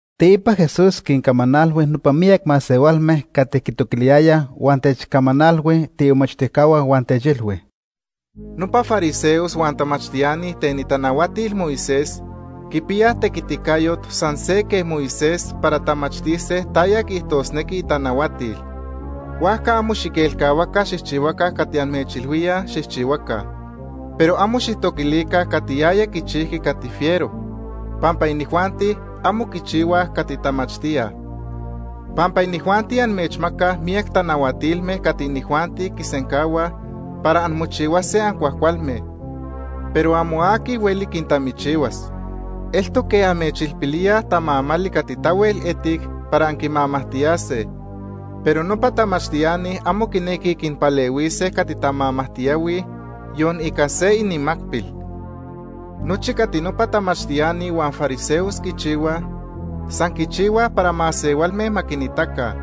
Teipa, Jesús quincamanalhui nopa miyac masehualme cati quitoquiliyayaj huan techcamanalhui tiimomachtijcahua huan techilhui: “Nopa fariseos huan tamachtiani ten itanahuatil Moisés quipiyaj tequiticayot san se quej Moisés para tamachtise taya quiijtosnequi itanahuatil. Huajca amo xiquelcahuaca xijchihuaca cati amechilhuíaj xijchihuaca. Pero amo xijtoquilica cati yaya quichijqui cati fiero, pampa inijuanti amo quichihuaj cati tamachtíaj. Pampa inijuanti amechmacaj miyac tanahuatilme cati inijuanti quisencahuaj para anmochihuase ancuajcualme, pero amo aqui hueli quintamichihuas. Eltoc quej amechilpilíaj tamamali cati tahuel etic para anquimamajtiyase, pero nopa tamachtiani amo quinequij quinpalehuise cati tamamajtiyahuij yon ica se inimacpil. Nochi cati nopa tamachtiani huan fariseos quichihuaj, san quichihuaj para masehualme ma quinitaca.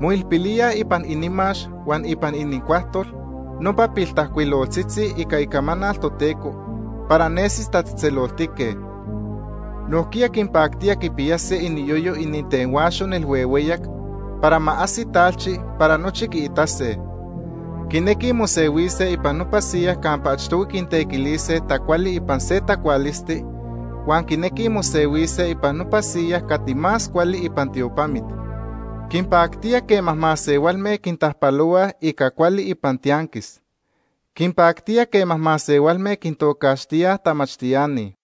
Moilpilíaj ipan inimax huan ipan inincuajtol nopa piltajcuiloltzitzi ica Icamanal Toteco, para nesise tatzejtzeloltique. Nojquiya quinpactía quipiyase iniyoyo itenhuaxo nelhuehueyac para ma ajsi talchi para nochi quiitase. Quinequij mosehuise ipan nopa siyas campa achtohui quintequilise tacuali ipan se tacualisti, huan quinequij mosehuise ipan nopa siyas cati más cuali ipan tiopamit. Quinpactía quema masehualme quintajpalohuaj ica cuali ipan tianquis. Quinpactía quema masehualme quintocaxtíaj tamachtiani.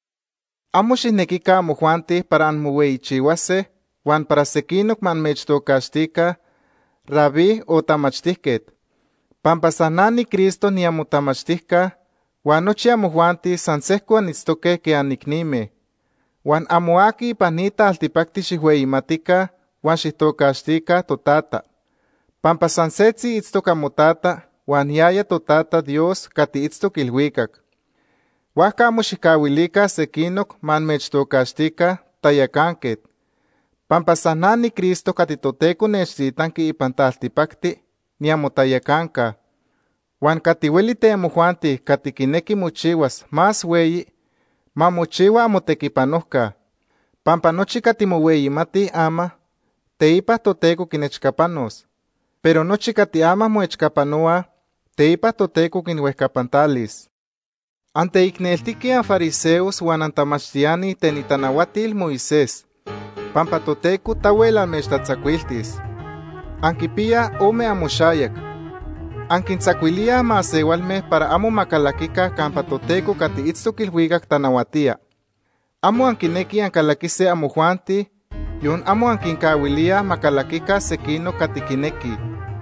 “Amo xijnequica amojuanti para anmohueyichihuase huan para sequinoc ma amechtocaxtica ‘Rabí’ o ‘Tamachtijquet’, pampa san na niCristo niamotamachtijca, huan nochi amojuanti san sejco anitztoque quej anicnime. Huan amo aqui ipan ni taltipacti xijhueyimatica huan xijtocaxtica ‘Totata’, pampa san setzi itztoc amoTata huan yaya Totata Dios cati itztoc ilhuicac. Huajca amo xijcahuilica sequinoc ma amechtocaxtica ‘Tayacanquet’ pampa san na niCristo cati Toteco nechtitanqui ipan taltipacti niamotayacanca. Huan cati hueli ten amojuanti cati quinequi mochihuas más hueyi, ma mochihua amotequipanojca. Pampa nochi cati mohueyimatij ama, teipa Toteco quinechcapanos, pero nochi cati ama moechcapanohuaj, teipa Toteco quinhuejcapantalis. “¡Anteicneltique anfariseos huan antamachtiani ten itanahuatil Moisés, pampa Toteco tahuel amechtatzacuiltis! Anquipiyaj ome amoxayac. Anquintzacuilíaj masehualme para amo ma calaquica campa Toteco cati itztoc ilhuicac tanahuatía. Amo anquinequij ancalaquise amojuanti, yon amo anquincahuilíaj ma calaquica sequinoc cati quinequij.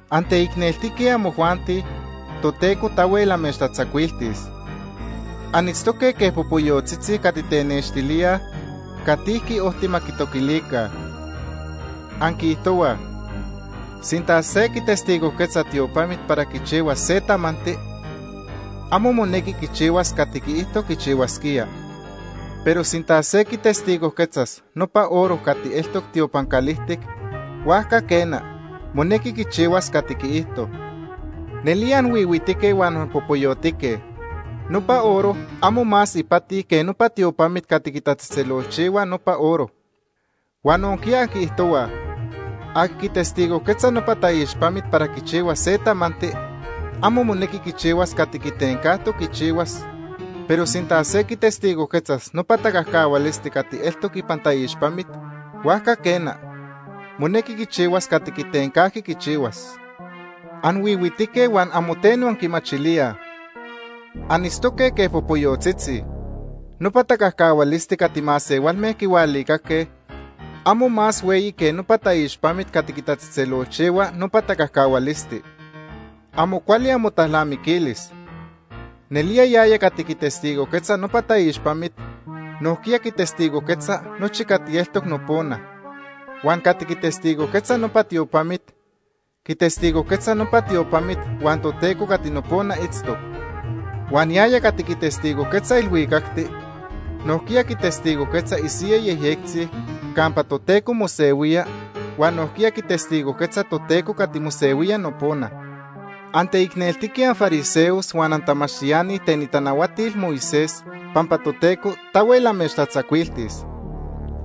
“¡Anteicneltique amojuanti, Toteco tahuel amechtatzacuiltis! Anitztoque quej popoyotzitzi cati tenextilíaj catijqui ojti ma quitoquilica. Anquiijtohuaj: ‘Sinta se quitestigojquetzas tiopamit para quichihuas se tamanti, amo monequi quichihuas cati quiijto quichihuasquía. Pero sinta se quitestigojquetzas nopa oro cati eltoc tiopan calijtic, huajca, quena, monequi quichihuas cati quiijto.’ ¡Nelía anhuihuitique huan anpopoyotique! Nopa oro amo más ipati que nopa tiopamit cati quitatzejtzelolchihua nopa oro. Huan nojquiya anquiijtohuaj: ‘Aqui quitestigojquetzas nopa taixpamit para quichihuas se tamanti, amo monequi quichihuas cati quitencajtoc quichihuas, pero sinta se quitestigojquetzas nopa tacajcahualisti cati eltoc ipan taixpamit, huajca quena, monequi quichihuas cati quitencajqui quichihuas.’ ¡Anhuihuitique huan amo teno anquimachilíaj! Anitztoque quej popoyotzitzi. Nopa tacajcahualisti cati masehualme quihualicaque amo más hueyi que nopa taixpamit cati quitatzejtzelolchihua nopa tacajcahualisti. ¡Amo cuali amotalnamiquilis! Nelía yaya cati quitestigojquetza nopa taixpamit nojquiya quitestigojquetza nochi cati eltoc nopona. Huan cati quitestigojquetza nopa tiopamit, quitestigojquetza nopa tiopamit huan Toteco cati nopona itztoc. Huan yaya cati quitestigojquetza ilhuicacti, nojquiya quitestigojquetza isiyaj yejyectzi campa Toteco mosehuía huan nojquiya quitestigojquetza Toteco cati mosehuía nopona. “¡Anteicneltique anfariseos huan antamachtiani ten itanahuatil Moisés, pampa Toteco tahuel amechtatzacuiltis!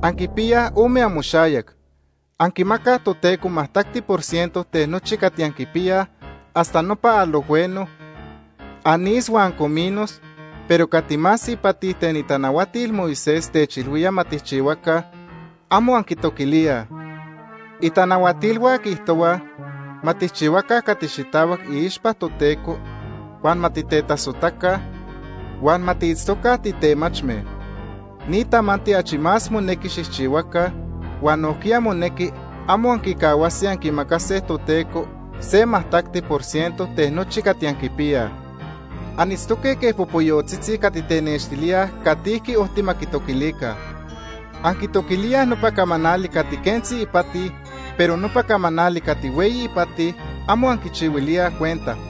¡Anquipiyaj ome amoxayac! Anquimacaj Toteco majtacti por ciento ten nochi cati anquipiyaj hasta nopa alojhueno, anís huan cominos, pero cati más ipati ten itanahuatil Moisés techilhuía ma tijchihuaca, amo anquitoquilíaj. Itanahuatilhua quiijtohuaj ma tijchihuaca cati xitahuac iixpa Toteco, huan ma titetasojtaca, huan ma tiitztoca titemachme. Ni tamanti achi más monequi xijchihuaca, huan nojquiya monequi amo anquicahuase anquimacase Toteco se majtacti por ciento ten nochi cati anquipiyaj. Anitztoque quej popoyotzitzi cati tenextilíaj catijqui ojti ma quitoquilica. Anquitoquilíaj nopa camanali cati quentzi ipati, pero nopa camanali cati hueyi ipati, amo anquichihuilíaj cuenta.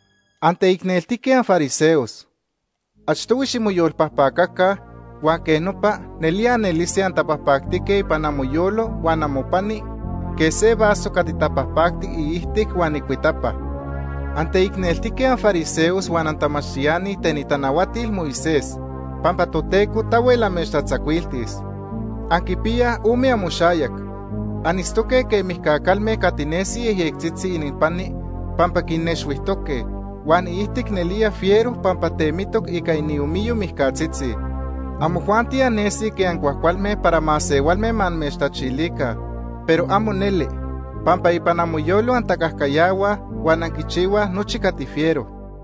¡Anteicneltique anfariseos! Achtohui ximoyolpajpacaca, huan quej nopa nelía anelise antapajpactique ipan amoyolo huan amopani quej se vaso cati tapajpacti iijtic huan icuitapa. “¡Anteicneltique anfariseos huan antamachtiani ten itanahuatil Moisés, pampa Toteco tahuel amechtatzacuiltis! Anquipiyaj ome amoxayac. Anitztoque quej mijca calme cati nesij yejyectzitzi ininpani pampa quinnexhuijtoque, huan iijtic nelía fiero pampa temitoc ica iniomiyo mijcatzitzi. Amojuanti annesij quej ancuajcualme para masehualme ma amechtachilica, pero amo neli, pampa ipan amoyolo antacajcayahuaj huan anquichihuaj nochi cati fiero.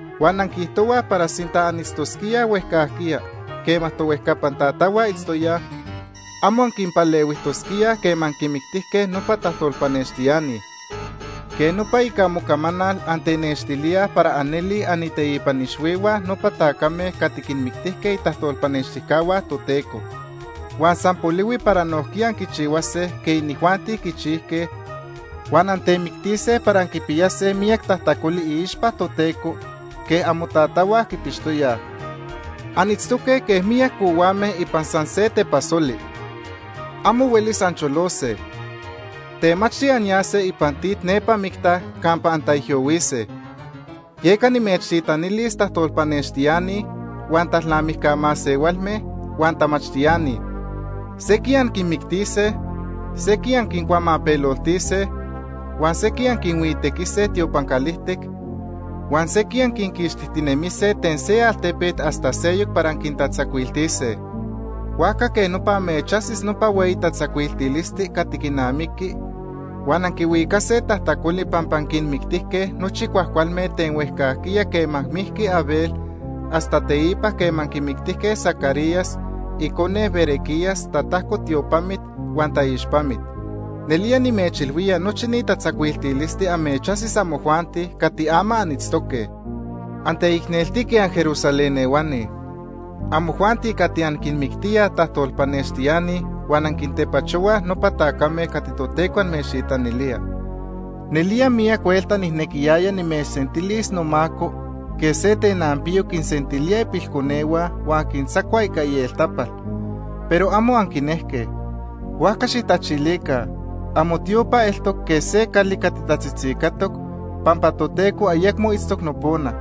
Huan anquiijtohuaj para sinta anitztosquíaj huejcajquiya quema tohuejcapan tatahua itztoyaj, amo anquinpalehuijtosquíaj quema quinmictijque nopa tajtolpanextiani. Quej nopa ica amocamanal antenextilíaj para anelij anininteipan ixhuihua nopa tacame cati quinmictise itajtolpanextijcahua Toteco. Huan san polihui para nojquiya anquichihuase quej inijuanti quichijque huan antemictise para anquipiyase miyac tajtacoli iixpa Toteco quej amotatahua quipixtoyaj. “Anitztoque quej miyac cohuame ipan san se tepasoli. Amo huelis ancholose. Temachti anyase ipan tit nepa micta campa antaijyohuise. Yeca nimechtitanilis tajtolpanextiani, huan talnamijca masehualme, huan tamachtiani. Sequij anquinmictise, sequij anquincuamapeloltise, huan sequij anquinhuitequise tiopan calijtic, huan sequij anquinquixtijtinemise ten se altepet hasta seyoc para anquintatzacuiltise. Huajca quej nopa amechajsis nopa hueyi tatzacuiltilisti cati quinamiqui, huan anquihuicase tajtacoli pampa anquinmictijque nochi cuajcualme ten huejcajquiya quema mijqui Abel hasta teipa quema anquimictijque Zacarías icone Berequías tatajco tiopamit huan taixpamit. Nelía nimechilhuía nochi ni tatzacuiltilisti amechajsis amojuanti cati ama anitztoque. “¡Anteicneltique anJerusalén ehuani! Amojuanti cati anquinmictíaj tajtolpanextiani huan anquintepachohuaj nopa tacame cati Toteco amechtitanilía. Nelía miyac huelta nijnequiyaya nimechsentilis nomaco quej se tenanpiyo quinsentilía ipilconehua huan quintzacua ica ieltapal, pero amo anquinejque. Huajca xijtachilica, amotiopa eltoc quej se cali cati tatzitzicatoc pampa Toteco ayecmo itztoc nopona.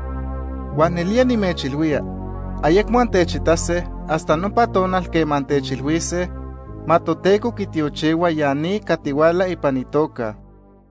Huan nelía nimechilhuía ayecmo antechitase hasta nopa tonal quema antechilhuise: ‘Ma Toteco quitiochihua ya ni cati huala ipan itoca Ica itequiticayo..’”